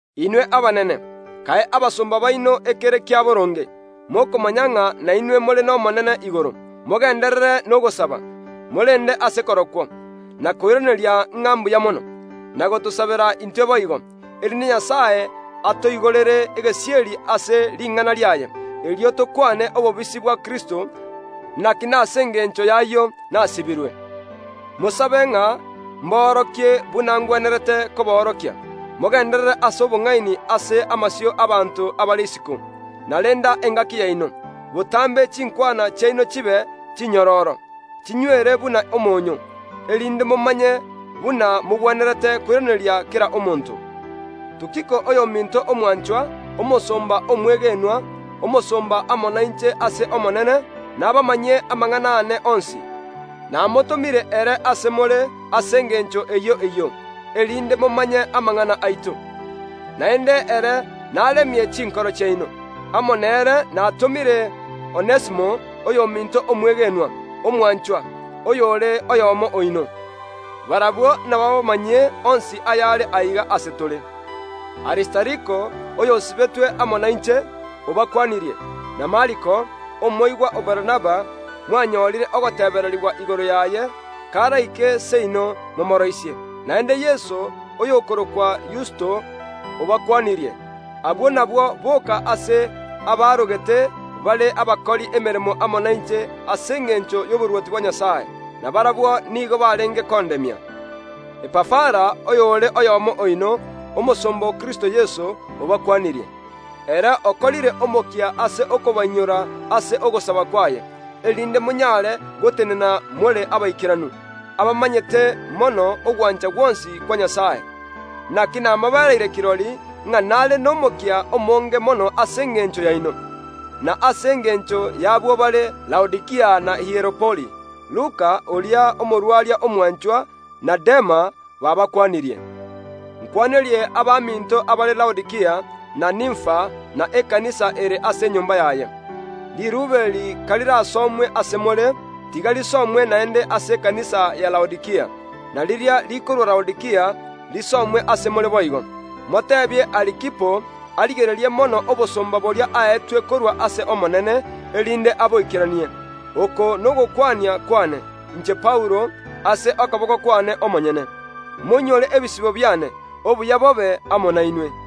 Inwe abanene, kae abasomba baino ekere kia boronge, mokomanya ng’a nainwe more n’Omonene igoro. Mogenderere nogosaba, morende ase korokwo, na koiraneria ng’a mbuya mono; na gotosabera intwe boigo, erinde Nyasae atoigorere egesieri ase ring’ana riaye, erio tokwane obobisi bwa Kristo, naki nase engencho y’ayio nasibirwe. Mosabe ng’a mboorokie buna ngwenerete koboorokia. Mogenderere ase obong’aini ase amasio ’abaanto abare isiko, na renda engaki yaino. Botambe chinkwana chiaino chibe chinyororo, chinywere buna omonyoo, erinde momanye buna mogwenerete koiraneria kera omonto. Tukiko oyominto omwanchwa, omosomba omwegenwa, omosomba amo nainche ase Omonene, nabamanyie amang’ana aane onsi. Namotomire ere ase more ase engencho eyio eyio, erinde momanye amang’ana aito, naende ere naremie chinkoro chiaino. Amo nere natomire Onesimo, oyominto omwegenwa, omwanchwa, oyore oyomo oino. Barabwo nabaabamanyie onsi ayare aiga ase tore. Aristariko, oyosibetwe amo nainche, obakwanirie, na Mariko, omwana oisemoke Barnaba (mwanyorire ogotebererigwa igoro yaye; karaike seino momooroisie). Naende Yeso, oyokorokwa Yusto, obakwanirie. Abwo nabwo boka ase abaarogete bare abakori emeremo amo nainche ase engencho y’oborwoti bwa Nyasae; na barabwo nigo barenge kondemia. Epafara oyore oyomo oino, omosomba o Kristo Yeso, obakwanirie. Ere okorire omokia ase okobainyora ase ogosaba kwaye, erinde monyare gotenena more abaikeranu, abamanyete mono ogwancha gwonsi kwa Nyasae. Naki namobereire kirori, ng’a nare nomokia omonge mono ase engencho yaino, na ase engencho y’abwo bare Laodikia na Hieropoli. Luka, oria omogwenia omwanchwa, na Dema babakwanirie. Nkwanerie abaminto abare Laodikia, na Nimfa, na ekanisa ere ase enyomba yaye. Riruube eri karirasomwe ase more, tiga risomwe naende ase ekanisa ya Laodikia; na riria rikorwa Laodikia risomwe ase more boigo. Moteebie Arikipo arigererie mono obosomba boria aetwe korwa ase Omonene, erinde aboikeranie. Oko nogokwania kwane, inche Paulo, ase okoboko kwane omonyene. Moinyore ebisibo biane. Obuya bobe amo nainwe.